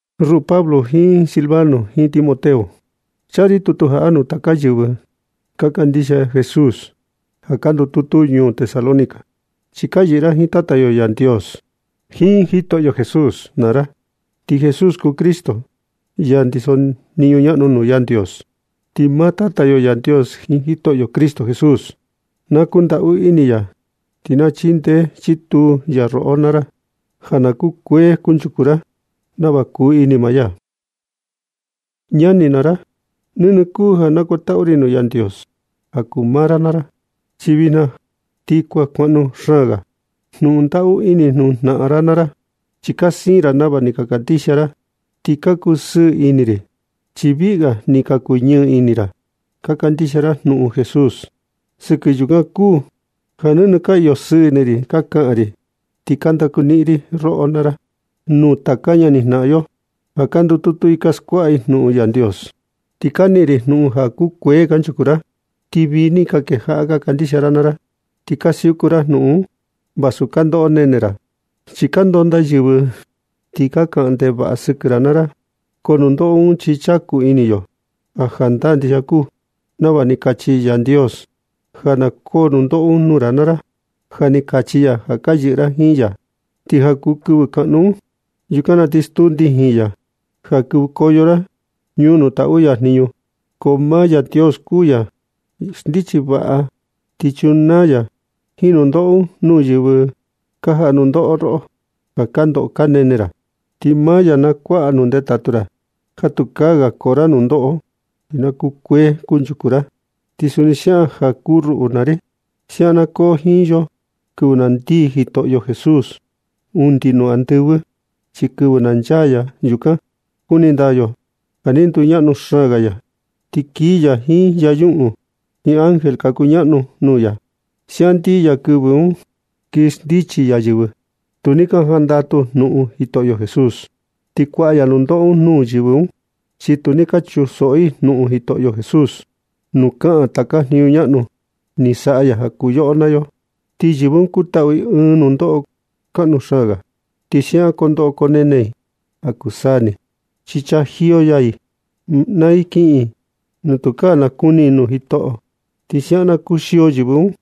Ruꞌu Pablo jiin Silvano jiin Timoteo, chaa ri tutu jaꞌa nuu taka yɨvɨ ka kandixia Jesús ja ka ndututu ñuu Tesalónica, chi ka yɨꞌɨ ra jiin Tata yo Yandios jiin Jitoꞌo Jesús naa ra. Ti Jesús kuu Cristo, ya ndiso jniñu ñaꞌnu nuu Yandios. Ti maa Tata yo Yandios jiin Jitoꞌo Cristo Jesús, na kundaꞌu ini ya ti na chindee chituu ya roꞌo naa ra ja na kukuee kunchuku ra nava kuni maa ya. Ñani naa ra, nɨnɨ kuu ja na nakuantaꞌu ri nuu Yandios ja kuu maa ra naa ra, chi vijna ti ja kuan kukaꞌnu xaan ga jnuꞌun ndaꞌu ini nuu jnaꞌan ra naa ra. Chi ni ka siin ra nava ni ka kandixia ra, ti ka kusɨɨ ini ri, chi viꞌi ga ni ka kuñɨɨ ini ra ja ka kandixia ra jnuꞌun Jesús. Sɨkɨ yukan kuu ja nɨnɨ ka iyo sɨɨ ini ri ka kaꞌan ri, ti ka ndaku niꞌin ri roꞌo naa ra nuu taka ñani jnaꞌan yo ja ka ndututu i ka skuaꞌa i jnuꞌun Yandios. Ti ka niꞌin ri jnuꞌun ja kukuee kanchuku ra, ti vii ni ka kejaꞌa ka kandixia ra naa ra, ti ka siuku ra jnuꞌun un vasu ka ndoꞌo ka nene ra. Chi ka ndondaa yɨvɨ ti ka kaꞌan ndevaꞌa i sɨkɨ ra naa ra. Ko nundoꞌo un chi chaku ini yo ja jandaa ndixia kuu nava ni kachi Yandios ja na koo nundoꞌo un nuu ra naa ra. Ja ni kachi ya ja ka yɨꞌɨ ra jiin ya, ti ja kuu kɨvɨ kaꞌnu un, yukan na ti stuu ndijin ya ja kɨvɨkoyo ra ñuu nuu taꞌu ya jniñu. Ko maa Yandios kuu ya xndichi vaꞌa, ti chunaa ya jiin nundoꞌo nuu yɨvɨ ka jaꞌa nundoꞌo roꞌo ja ka ndoꞌo ka nene ra. Ti maa ya na kuaꞌa nuu ndetatu ra ja tukaa ga koo ra nundoꞌo, ti na kukuee kunchuku ra, ti suni siaꞌan ja kuu ruꞌu naa ri. Siaꞌan na koo jiin yo kɨvɨ na ndii Jitoꞌo Jesús undi nuu andɨvɨ. Chi kɨvɨ na nchaa ya yukan na kuni ndaa yo ja ni nduñaꞌnu xaan ga ya, ti kii ya jiin yañuꞌun jiin ángel ka kuñaꞌnu nuu ya. Siaꞌan ndii ya kɨvɨ un, ti kii xndichi ya yɨvɨ tu ni ka jandatu jnuꞌun Jitoꞌo Jesús, ti kuaꞌa ya nundoꞌo nuu yɨvɨ un, chi tu ni ka chunsoꞌo i jnuꞌun Jitoꞌo Jesús, nuu kaꞌan taka jniñu ñaꞌnu ni saꞌa ya ja kuu yoꞌo naa yo. Ti yɨvɨ un kutaꞌu i ɨɨn nundoꞌo kaꞌnu xaan ga, ti siaꞌan kondoꞌo konene i ja kuu saa ni, chi chajiyo ya i naa i kiꞌin i nuu tukaa ga nakuni i nuu Jitoꞌo. Ti siaꞌan na kuxio yɨvɨ un,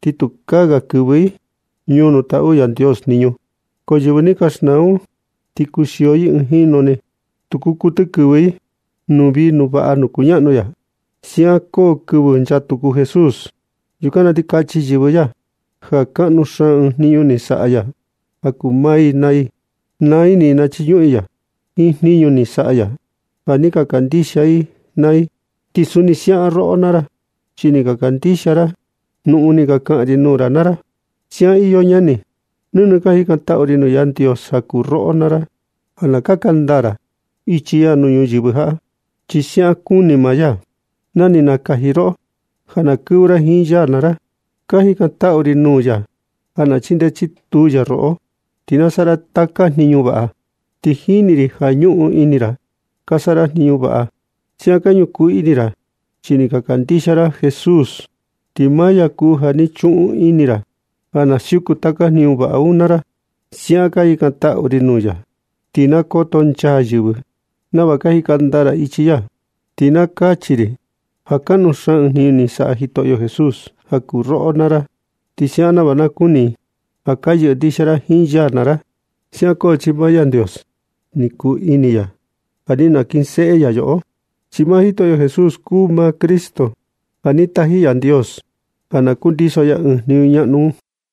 ti tukaa ga kɨvɨ i ñuu nuu taꞌu Yandios jniñu. Ko yɨvɨ ni ka xnaa un ti kuxio i ɨɨn jinu ni. Tu kuu kuɨtɨ kɨvɨ i nuu vii nuu vaꞌa nuu kuñaꞌnu ya. Ti siaꞌan koo kɨvɨ nchaa tuku Jitoꞌo Jesús. Yukan na ti kachi yɨvɨ ya ja kaꞌnu xaan ɨɨn jniñu ni saꞌa ya ja kuu maa i naa i. Naa ini i nachiñuꞌun i ya jiin jniñu ni saꞌa ya ja ni ka kandixia i naa i. Ti suni siaꞌan roꞌo naa ra, chi ni ka kandixia ra jnuꞌun ni ka kaꞌan ri nuu ra naa ra. Siaꞌan iyo ñani, nɨnɨ ka jikantaꞌu ri nuu Yandios ja kuu roꞌo naa ra, ja na kaka ndaa ra ichi ya nuu ñuyɨvɨ jaꞌa. Chi siaꞌan kuni maa ya na ni nakaji ya roꞌo ja na kɨvɨ ra jiin ya naa ra. Ka jikantaꞌu ri nuu ya ja na chindee chituu ya roꞌo, ti na saꞌa ra taka jniñu vaꞌa, chi jini ri ja ñuꞌun ini ra ka saꞌa ra jniñu vaꞌa. Siaꞌan ka ñukuu ini ra chi ni ka kandixia ra Jesús, ti maa ya kuu ja ni chuꞌun ini ra ja na siuku ra taka jniñu vaꞌa un naa ra. Siaꞌan ka jikantaꞌu ri nuu ya, ti na kotonchaa yɨvɨ nava ka jika ndaa ra ichi ya. Ti na kachi i ja kaꞌnu xaan ɨɨn jniñu ni saꞌa Jitoꞌo Jesús ja kuu roꞌo naa ra. Ti nava siaꞌan na kuni i ja ka yɨꞌɨ ndixia ra jiin ya naa ra. Siaꞌan koo chi maa Yandios ni kuu ini ya ja ni nakinseꞌe ya yoꞌo. Chi maa Jitoꞌo Jesús kuu maa Cristo ja ni taji Yandios ja na kundiso ya ɨɨn jniñu ñaꞌnu un.